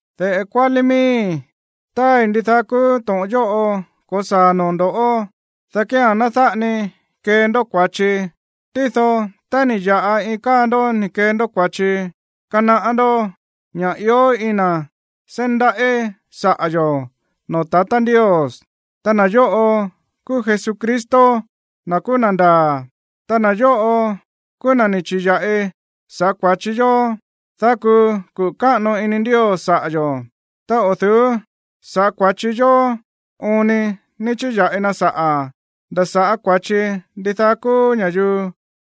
De̱ꞌe kuálí miíi̱, táai ndidaá kúú to̱ꞌon yóꞌo ko̱saa̱ noo̱ ndo̱, dá kía̱n ná dáꞌa ni kee ndó kua̱chi. Tído tá ni̱ ya̱ꞌa iin káa ndó ni̱ kee ndó kua̱chi, kanaꞌá ndó ña̱ ió iin na̱ seí ndaꞌí saꞌa̱ yo̱ noo̱ tatá Ndios. Ta na̱ yóꞌo kúú Jesucristo, na̱ kúú na̱ ndaa̱. Ta na̱ yóꞌo kúú na̱ ni̱ chi̱ya̱ꞌi saꞌa̱ kua̱chi yó, dá kuu kuꞌu̱ káꞌano ini Ndios saꞌa̱ yo̱. Ta o̱ du̱ú saꞌa̱ kua̱chi yó oon ni ni̱ chi̱ya̱ꞌi na saꞌa̱, nda̱ saꞌa̱ kua̱chi ndidaá kúú ña̱yuu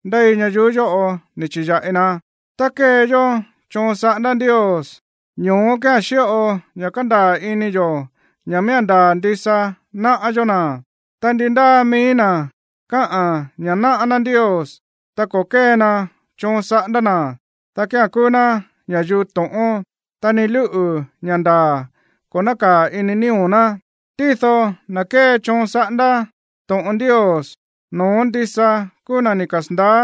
ndéi ñayuú yóꞌo ni̱ chi̱ya̱ꞌi na. Tá kée yó choon saꞌándá Ndios, ñoó kía̱n xíꞌo ña̱ kandaa̱ ini yo̱ ña̱ miía̱n ndaa̱ ndisa náꞌá yó na̱. Ta ndi ndáa mií na̱ kaá ña̱ náꞌá ná Ndios, ta ko̱ kée na choon saꞌándá na̱, dá kía̱n kúú ná ña̱yuu to̱ꞌón, ta ni lúꞌu̱ ña̱ ndaa̱ ko̱ nákaa̱ ini nío̱ ná. Tído na̱ kée choon saꞌándá to̱ꞌon Ndios, no̱ón ndisa kúú na̱ ni̱ kasa̱ndaá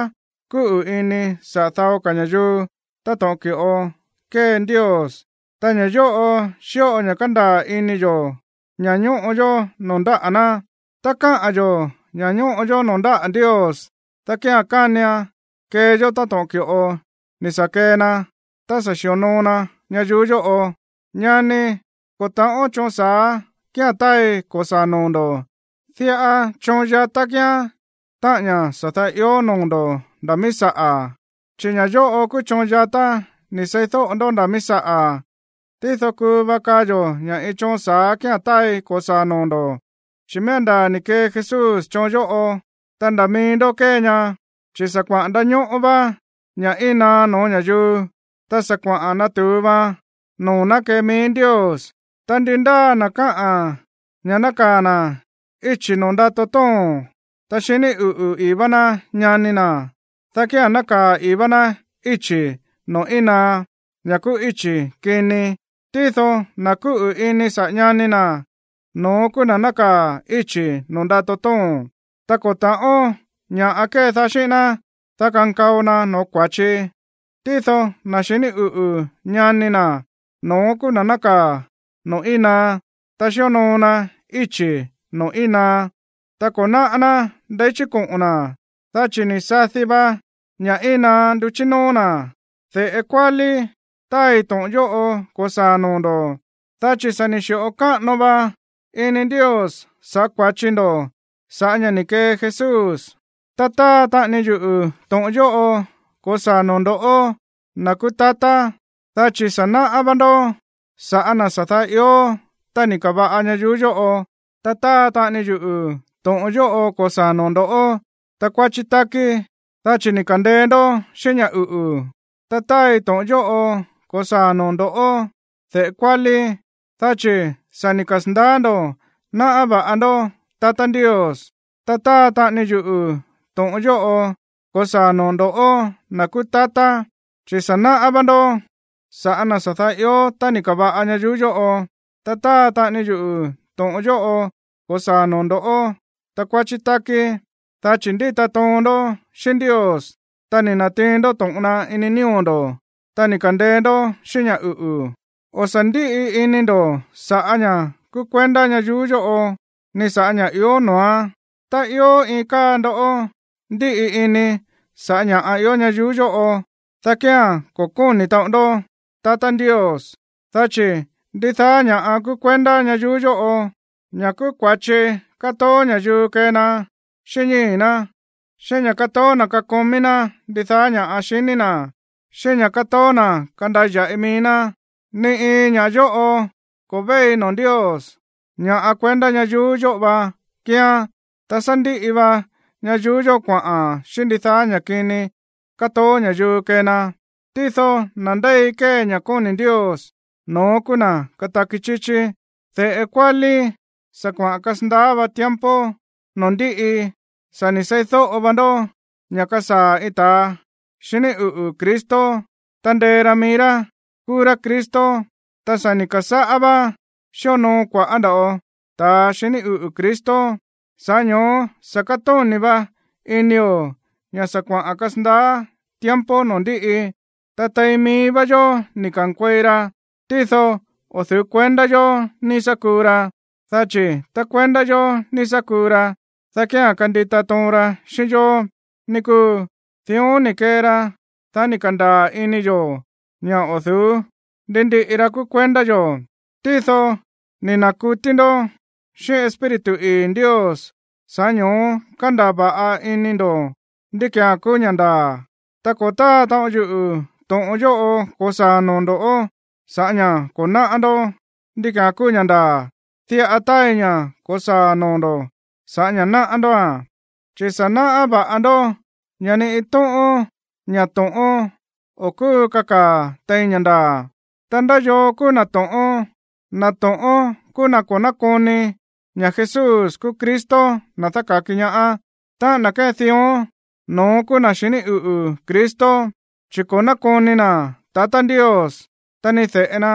kúꞌu̱ ini saꞌa̱ dao ka̱ ña̱yuu táto̱ꞌon ki̱ꞌo kée Ndios. Ta ña̱ yóꞌo xíꞌo ña̱ kándaa̱ ini yo̱ ña̱ ñóꞌo yó noo̱ ndáꞌa̱ ná. Tá kaá yo̱ ña̱ ñóꞌo yó noo̱ ndáꞌa̱ Ndios, dá kía̱n kánian kee yó táto̱ꞌon ki̱ꞌo ni̱ sa̱ kee na tá sa̱ xi̱onoo na ñayuú yóꞌo. Ñani, ko̱ ta̱ꞌón choon sa̱á kía̱n táai ko̱saa̱ noo̱ ndo̱. Diꞌa choon yatá kíán, táꞌa̱n ña̱ sa̱ daá ió noo̱ ndo̱ nda̱ mií saꞌa̱, chi̱ ña̱ yóꞌo kúú choon yatá ni̱ seídóꞌo ndó nda̱ mií saꞌa̱. Tído kuu va kaa yo̱ ña̱ iin choon sa̱á kía̱n táai ko̱saa̱ noo̱ ndo̱, chi̱ miía̱n ndaa̱ ni̱ kee Jesús choon yóꞌo, ta nda̱ mií ndó kée ña. Chi̱ sa̱ kuaꞌa̱n ndañóꞌó vá ña̱ íin naá no̱ó ña̱yuu, ta sa̱ kuaꞌa̱n natu̱u va noo̱ ná kée mií Ndios. Ta ndi ndáa na̱ kaá ña̱ nákaa̱ na̱ íchi̱ noo̱ ndato tóo̱n, ta xiní uꞌu̱ i̱í vá ná ñani na̱, dá kía̱n nákaa̱ i̱í vá ná íchi̱ noo̱ íin naá, ña̱ kúú íchi̱ kini. Tído na̱ kúꞌu̱ ini saꞌa̱ ñani na̱, no̱ón kúú na̱ nákaa̱ íchi̱ noo̱ ndato tóo̱n, ta ko̱ ta̱ꞌón ña̱ꞌa kédaá xíꞌín ná, dá kankao na no̱ó kua̱chi. Tído na̱ xiní uꞌu̱ ñani na̱, no̱ón kúú na̱ nákaa̱ noo̱ íin naá, ta xíonoo na íchi̱ noo̱ íin naá, ta ko̱ náꞌá ná ndeí chí koꞌo̱n na̱, dá chi̱ ni̱ sadi va ña̱ íin naá nduchí nóó na̱. De̱ꞌe kuálí, táai to̱ꞌon yóꞌo ko̱saa̱a̱n noo̱ ndo̱, dá chi̱ sa̱ ni̱ xi̱ꞌo káꞌano va ini Ndios sa̱ꞌá kua̱chi ndó sa̱ꞌá ña̱ ni̱ kee Jesús. Ta táa taꞌani yuꞌu̱ to̱ꞌon yóꞌo ko̱saa̱a̱n noo̱ ndo̱ꞌó, na̱ kúú tatá, dá chi̱ sa̱ náꞌá vá ndó sa̱ꞌá na̱ sa̱ daá ió tá ni̱ ka̱va̱ꞌa ñayuú yóꞌo. Ta táa taꞌani yuꞌu̱ to̱ꞌon yóꞌo ko̱saa̱a̱n noo̱ ndo̱ꞌó, takuáchí tákí, dá chi̱ ni̱ ka̱ndeé ndó xíꞌín ña̱ uꞌu̱. Ta táai to̱ꞌon yóꞌo ko̱saa̱a̱n noo̱ ndo̱ꞌó, de̱ꞌe kuálí, dá chi̱ sa̱ ni̱ kasa̱ndaá ndo̱ náꞌá va̱ꞌa ndó tatá Ndios. Ta táa taꞌani yuꞌu̱ to̱ꞌon yóꞌo ko̱saa̱a̱n noo̱ ndo̱ꞌó, na̱ kúú tatá, chi̱ sa̱ náꞌá vá ndó sa̱ꞌá na̱ sa̱ daá ió tá ni̱ ka̱va̱ꞌa ñayuú yóꞌo. Ta táa taꞌani yuꞌu̱ to̱ꞌon yóꞌo ko̱saa̱a̱n noo̱ ndo̱ꞌó, takuáchí tákí, dá chi̱ ndíta toon ndó xíꞌín Ndios, ta ni̱ na̱tiin ndó to̱ꞌon na ini nío̱ ndo̱, ta ni̱ ka̱ndeé ndó xíꞌín ña̱ uꞌu̱. O̱ sa̱ ndíꞌi ini ndo̱ sa̱ꞌá ña̱ kúú kuendá ñayuú yóꞌo, ni sa̱ꞌá ña̱ꞌa ió noo̱án. Ta ió iin káa ndó ndíꞌi ini sa̱ꞌá ña̱ ió ñayuú yóꞌo, dá kía̱n ko̱ kóni̱ taꞌon ndó tatá Ndios. Dá chi̱ ndidaá ña̱ꞌa kúú kuendá ñayuú yóꞌo, ña̱ kúú kua̱chi kátoó ña̱yuu kée na xíꞌín ñíi̱ ná, xíꞌín ña̱ kátoó na̱ kakomí ná ndidaá ña̱ꞌa xiní na̱, xíꞌín ña̱ kátoó na̱ kandaya̱ꞌi mií ná, ni iin ña̱ yóꞌo ko̱ véi noo̱ Ndios, ña̱ꞌa kuendá ñayuú yóꞌo va kíán. Ta sá ndíꞌi va ñayuú yóꞌo kuaꞌa̱n xíꞌín ndidaá ña̱ kini kátoó ña̱yuu kée na. Tído na̱ ndéi kée ña̱ kóni̱ Ndios, no̱ón kúú na̱ kataki chíchí. De̱ꞌe kuálí, sa̱ kuaꞌa̱n kasandaá va tiempo noo̱ ndíꞌi. Sa̱ ni̱ seídóꞌo vá ndó ña̱ kasaa̱ iin ta̱a xiní uꞌu̱ Cristo, ta ndee ra mií rá kúú rá Cristo. Ta sa̱ ni̱ ka̱sáꞌá vá xíonoo kua̱ꞌá nda̱ꞌo ta̱a xiní uꞌu̱ Cristo. Sa̱ꞌá ño̱ó sa̱ kátóni̱ va inio̱ ña̱ sa̱ kuaꞌa̱n kasandaá tiempo noo̱ ndíꞌi. Ta tein mií vá yó ni̱ ka̱nkuei ra, tído o̱ du̱ú kuendá yo̱ ni̱ sa̱ kuu ra. Dá chi̱ tá kuendá yo̱ ni̱ sa̱ kuu ra, dá kía̱n kandita toon ra xíꞌín yó, ní kúu. Dión ni̱ kee ra, dá ni̱ ka̱ndaa̱ ini yo̱ ña̱ o̱ du̱ú ndi ndiꞌi ra kúú kuendá yo̱. Tído ni̱ na̱kutí ndó xíꞌín Espíritu ii̱ Ndios, sa̱ꞌá ño̱ó kándaa̱ va̱ꞌa ini ndo̱ ndí ki̱án kúú ña̱ ndaa̱. Ta ko̱ táa taꞌon yuꞌu̱ to̱ꞌon yóꞌo ko̱saa̱a̱n noo̱ ndo̱ sa̱ꞌá ña̱ ko̱ náꞌá ndó ndí ki̱án kúú ña̱ ndaa̱. Diꞌa táai ña̱ ko̱saa̱ noo̱ ndo̱ sa̱ꞌá ña̱ náꞌá ndóa̱n. Chi̱ sa̱ náꞌá va̱ꞌa ndó ña̱ ni iin tóꞌón ña̱ to̱ꞌón o̱ kúu kakaa̱ tein ña̱ ndaa̱. Ta, ¿ndá yoo kúú na̱ to̱ꞌón? Na̱ to̱ꞌón kúú na̱ ko̱ nákoni ña̱ Jesús kúú Cristo, na̱ dáka̱ki ñaá. Táꞌa̱n na̱ kée dión, no̱ón kúú na̱ xiní uꞌu̱ Cristo, chi̱ ko̱ nákoni na̱ tatá Ndios, ta ni de̱ꞌe na.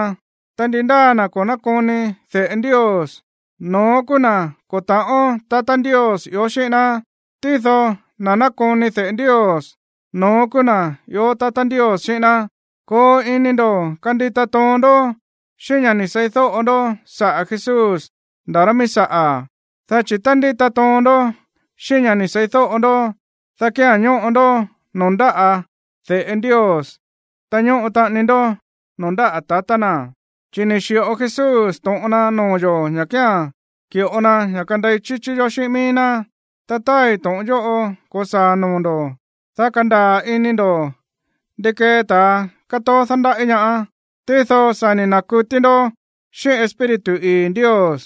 Ta ndi ndáa na̱ ko̱ nákoni de̱ꞌe Ndios, no̱ón kúú na̱ ko̱ ta̱ꞌón tatá Ndios ió xíꞌín ná. Tído na̱ nákoni de̱ꞌe Ndios, no̱ón kúú na̱ ió tatá Ndios xíꞌín ná. Koo ini ndo̱ kandita toon ndó xíꞌín ña̱ ni̱ seídóꞌo ndó saꞌa̱ Jesús nda̱ rá mií saꞌa̱. Dá chi̱ tá ndíta toon ndó xíꞌín ña̱ ni̱ seídóꞌo ndó, dá kía̱n ñóꞌo ndó noo̱ ndáꞌa̱ de̱ꞌe Ndios, ta ñóꞌo taꞌani ndó noo̱ ndáꞌa̱ tatá na̱. Chi̱ ni̱ xi̱ꞌo Jesús to̱ꞌon na noo̱ yo̱ ña̱ kía̱n ki̱ꞌo na ña̱ kandei chíchí yó xíꞌín mií ná. Ta táai to̱ꞌon yóꞌo ko̱saa̱ noo̱ ndo̱, dá kandaa̱ ini ndo̱ ndi kée ta̱a kátoó dándaꞌí ñaá. Tído sa̱ ni̱ na̱kutí ndó xíꞌín Espíritu ii̱ Ndios,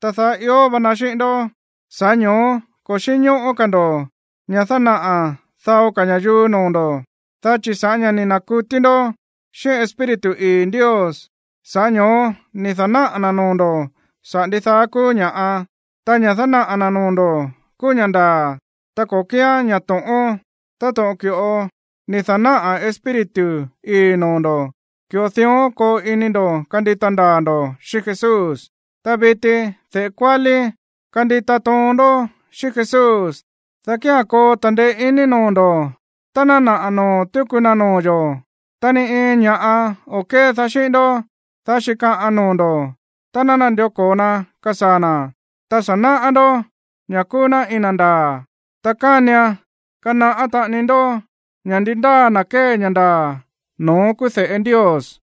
ta daá ió va na xíꞌín ndó. Sa̱ꞌá ño̱ó ko̱ xínñóꞌó ka̱ ndo̱ ña̱ dánaꞌa̱ dao ka̱ ña̱yuu noo̱ ndo̱, dá chi̱ sa̱ꞌá ña̱ ni̱ na̱kutí ndó xíꞌín Espíritu ii̱ Ndios, sa̱ꞌá ño̱ó ni̱ dánaꞌa̱ na̱ noo̱ ndo̱ saꞌa̱ ndidaá kúú ña̱ꞌa. Ta ña̱ dánaꞌa̱ na̱ noo̱ ndo̱ kúú ña̱ ndaa̱, ta ko̱ kíán ña̱ to̱ꞌón. Táto̱ꞌon ki̱ꞌo ni̱ dánaꞌa̱ Espíritu ii̱ noo̱ ndo̱, ki̱ꞌo dión koo ini ndo̱ kandita ndaa̱ ndo̱ xíꞌín Jesús. Ta viti, de̱ꞌe kuálí, kandita toon ndó xíꞌín Jesús, dá kía̱n koo ta̱ndeé iní noo̱ ndo̱ tá ná naꞌa̱ noo̱ tuku na noo̱ yo̱. Ta ni iin ña̱ꞌa o̱ kédaá xíꞌín ndó, dá xíkaꞌan noo̱ ndo̱ tá ná nandió ko̱o na kasaa̱ na̱. Ta sa̱ náꞌá ndó ña̱ kúú ná iin na̱ ndaa̱, ta kánian kanaꞌá taꞌani ndó ña̱ ndi ndáa na̱ kée ña̱ ndaa̱, no̱ón kúú de̱ꞌe Ndios.